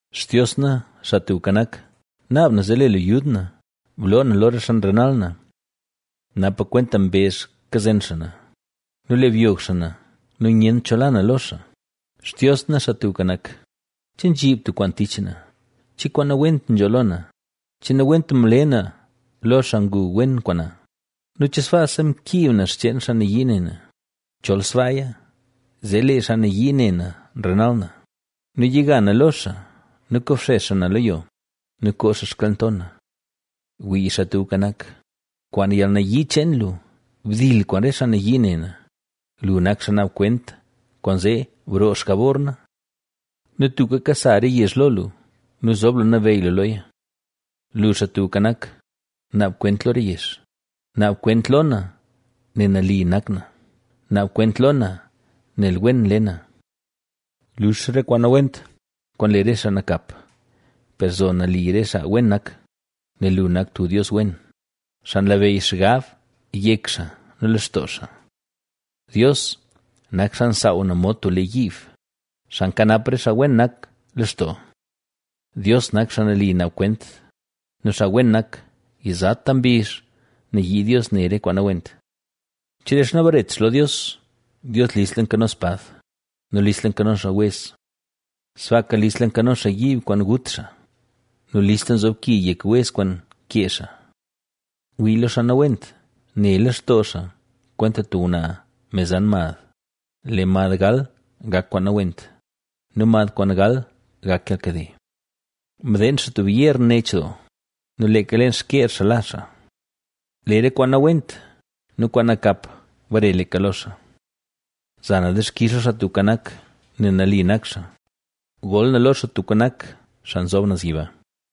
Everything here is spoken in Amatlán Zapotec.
Xtios na, Xaa Tubka Nak, naab na zee le lu yud na; bloo na lo re xaa nrenal na. Napa kwenta mbezh kazen xaa na nu le byog xaa na nu nyent cho la na lo xaa. Xtios na, Xaa Tubka Nak, ¿Che nzhib tub kwaan tich na? ¿Che kwaan nawent nzho lo na? ¿Che nawent mle na lo xaa ngu wen kwaan na? ¿Nu che sbaasa mkiib na xcheen xaa nayii ne na? Chol sbaaya zee lee xaa nayii ne na renal na nu yiga na lo xaa nu kobxex xaa na lo yo nu koo xaa xkalnto na. Wii, Xaa Tubka Nak, kwaan yalnayii cheen lu, ¡Bdil kwaan re xaa nayii ne na! Lu nak xaa naab kwent kwaanzee broo xjabor na. Nu tuka kasa re yezh lo lu nu zob lu nabeyy lu loya. Lu, Xaa Tubka Nak, naab kwent lo re yezh; naab kwent lo na nel nali nak na, naab kwent lo na nel wen nle na. Lux re kwaan nawent, kwaan nle re xaa nakap, per zo nali re xaa wen nak, nel lu nak tub Dios wen, xaa nlabeyy xgab yek xaa nu lextoo xaa. Dios, nak xaa nsaaw na mod tub lee yiib, xaa nkanap re xaa wen nak lextoo. Dios nak xaa nali naab kwent, nu xaa wen nak, yizata mbizh nayii Dios ne re kwaan nawent. Chelee xaa nabaret xaa lo Dios, Dios listla nkano spad nu listla nkano xaa wez. Sbaaka listla nkano xaa yiib kwaan gut xaa nu listla nzob ki yek wez kwaan kee xaa. Wii lo xaa nawent, ne lextoo xaa kwenta tub ngwnaa me zan mad, lee mad gal gak kwaan nawent, nu mad kwaan gal gak yalkade. Mdeen xaa tub yeer nech doo nu leeka leen xkyeer xaa la xaa. Lee re kwaan nawent nu kwaan nakap, bare leeka lo xaa. Za na dixkix lo Xaa Tubka Nak, nel nali nak xaa, gol na lo Xaa Tubka Nak, Xaa Nzob Naz Yiba.